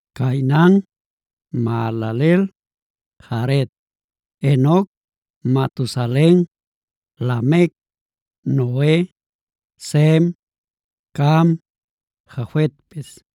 Cainan, Mahalaleel, Jared, Enoc, Matusalen, Lamec, Noe, Sem, Cam, Jafetpis.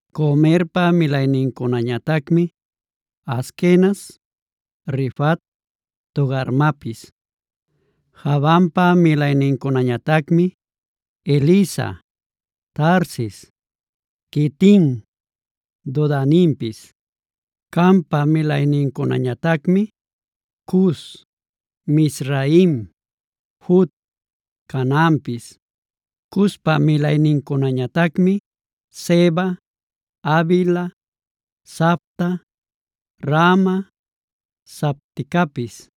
Gomerpa milaynincunañatacmi: Askenaz, Rifat, Togarmapis. Javanpa milaynincunañatacmi: Elisa, Tarsis, Quitim, Dodanimpis. Campa milaynincunañatacmi: Cus, Mizraim, Fut, Canaanpis. Cuspa milaynincunañatacmi: Seba, Havila, Sabta, Raama, Sabtecapis.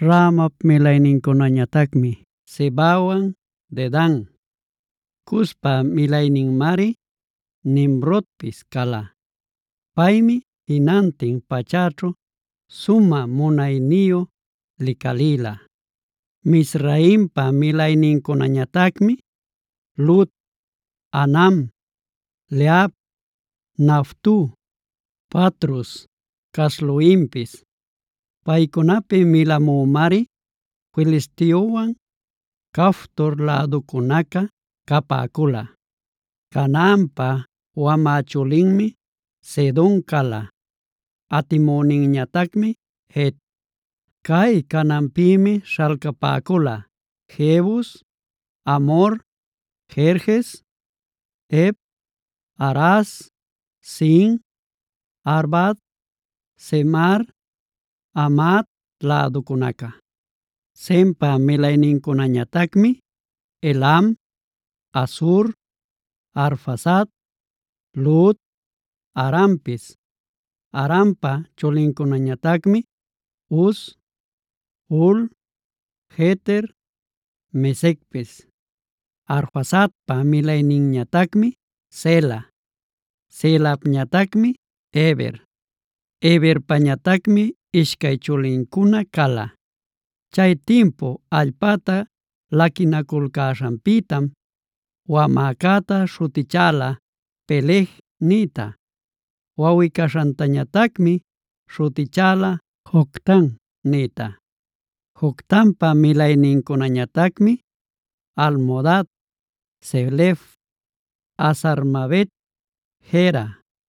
Raamap milaynincunañatacmi Sebawan Dedan. Cuspa milayninmari Nimrodpis cala. Paymi jinantin pachäćhu sumä munayniyu licalïla. Mizraimpa milaynincunañatacmi: Lud, Anam, Lehab, Naftuh, Patrus, Casluhimpis. Paycunapi milamümari Filisteowan Caftor läducunaca capäcula. Canaanpa wamä chulinmi Sidon cala, atimüninñatacmi Het. Cay Canaanpïmi śhalcapäcula: Jebus, Amhor, Gerges, Hev, Araz, Sin, Arvad, Zemar, Hamat läducunaca. Sempa milaynincunañatacmi: Elam, Asur, Arfaxad, Lud, Arampis. Arampa chulincunañatacmi: Uz, Hul, Geter, Mesecpis. Arfaxadpa milayninñatacmi Sela, Selapñatacmi Heber. Heberpañatacmi ishcay chulincuna cala; chay timpu allpacta laquinaculcäśhanpïtam wamäcäta śhutichäla “Peleg”a nïta; wawꞌi-caśhantañatacmi śhutichäla “Joctan” nïta. Joctanpa milaynincunañatacmi: Almodad, Selef, Hazar-mavet, Jera,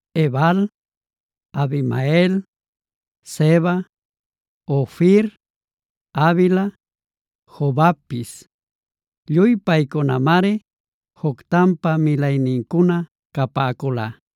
Ebal, Abimael, Seba, Ofir, Havila, Jobabpis. Lluy paycunamari Joctanpa milaynincuna capäcula.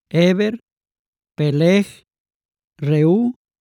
Heber, Peleg, Reu,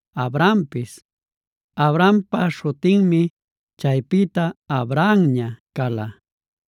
Abrampis. Abrampa śhutinmi chaypïta Abrahamña cala.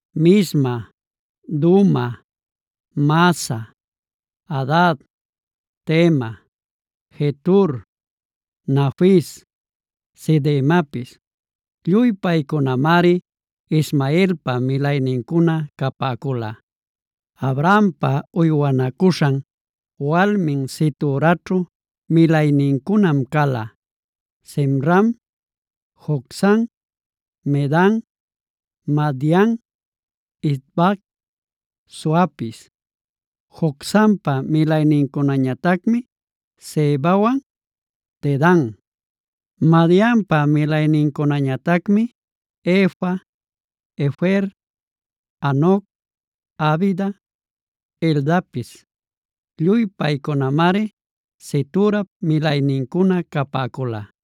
Misma, Duma, Massa, Hadad, Tema, Jetur, Nafis, Cedemapis. Lluy paycunamari Ismaelpa milaynincuna capäcula. Abrahampa uywanacuśhan walmin Ceturaćhu milaynincunam cala: Zimram, Jocsan, Medan, Madian, Isbac, Suapis. Jocsanpa milaynincunañatacmi Sebawan Dedan. Madianpa milaynincunañatacmi: Efa, Efer, Hanoc, Abida, Eldapis. Lluy paycunamari Ceturap milaynincuna capäcula.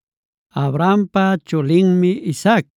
Abrahampa chulinmi Isaac.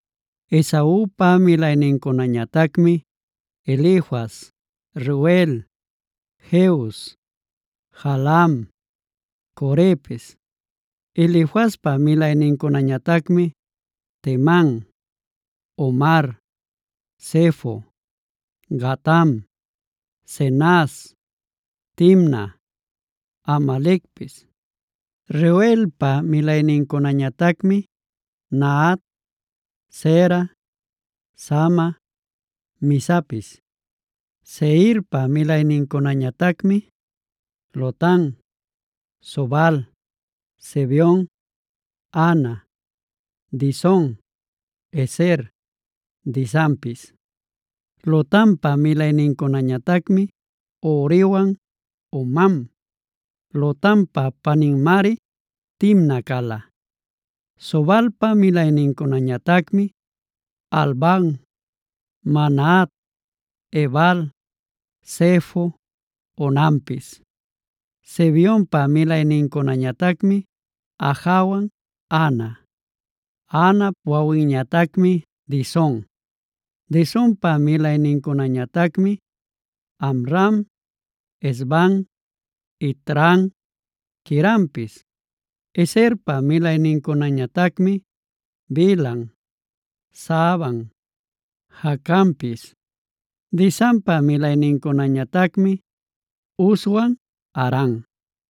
Esaupa milaynincunañatacmi: Elifaz, Reuel, Jeus, Jaalam, Corepis. Elifazpa milaynincunañatacmi: Teman, Omar, Zefo, Gatam, Cenaz, Timna, Amalecpis. Reuelpa milaynincunañatacmi: Nahat, Zera, Sama, Mizapis. Seirpa milaynincunañatacmi: Lotan, Sobal, Zibeon, Ana, Dison, Ezer, Disanpis. Lotanpa milaynincunañatacmi Horiwan Homam. Lotanpa paninmari Timna cala. Sobalpa milaynincunañatacmi: Alvan, Manahat, Ebal, Sefo, Onampis. Zibeonpa milaynincunañatacmi Ajawan Ana. Anap wawinñatacmi Dison. Disonpa milaynincunañatacmi: Amram, Esban, Itran, Queranpis. Ezerpa milaynincunañatacmi: Bilhan, Zaavan, Jaacanpis. Disanpa milaynincunañatacmi Uzwan Aran.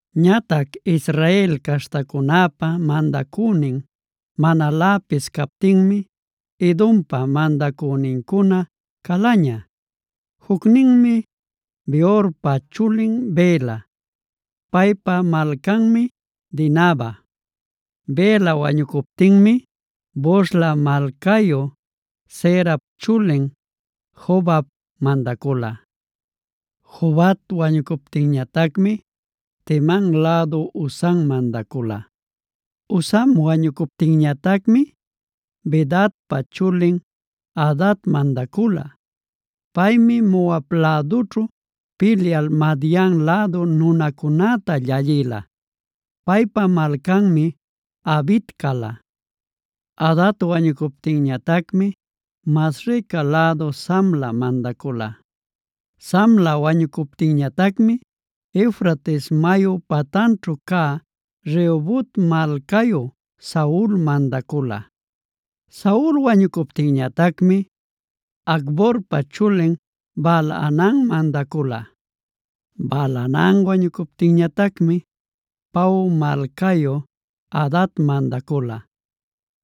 Ñatac Israel caśhtacunäpa mandacünin manaläpis captinmi Edompa mandacünincuna calaña: Jucninmi Beorpa chulin Bela; paypa malcanmi Dinaba. Bela wañucuptinmi Bosra malcayu Zerap chulin Jobab mandacula. Jobab wañucuptinñatacmi Teman lädu Husam mandacula. Husam wañucuptinñatacmi Bedadpa chulin Hadad mandacula. Paymi Moab lädućhu pilyal Madian lädu nunacunäta llallïla. Paypa malcanmi Avit cala. Hadad wañucuptinñatacmi Masreca lädu Samla mandacula. Samla wañucuptinñatacmi Eufrates mayu patanćhu cä Rehobot malcayu Saul mandacula. Saul wañucuptinñatacmi Acborpa chulin Baal-hanan mandacula. Baal-hanan wañucuptinñatacmi Pau malcayu Hadad mandacula.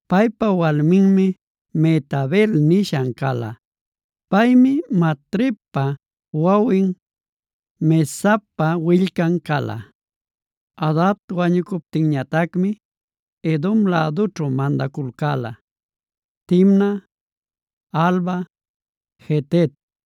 Paypa walminmi Mehetabel nishan cala. Paymi Matredpa wawin, Mezaabpa willcan cala. Hadad wañucuptinñatacmi Edom lädućhu mandaculcäla: Timna, Alva, Jetet,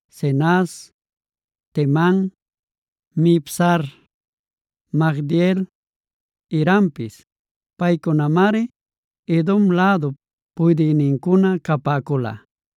Cenaz, Teman, Mibzar, Magdiel, Irampis. Paycunamari Edom lädup puydïnincuna capäcula.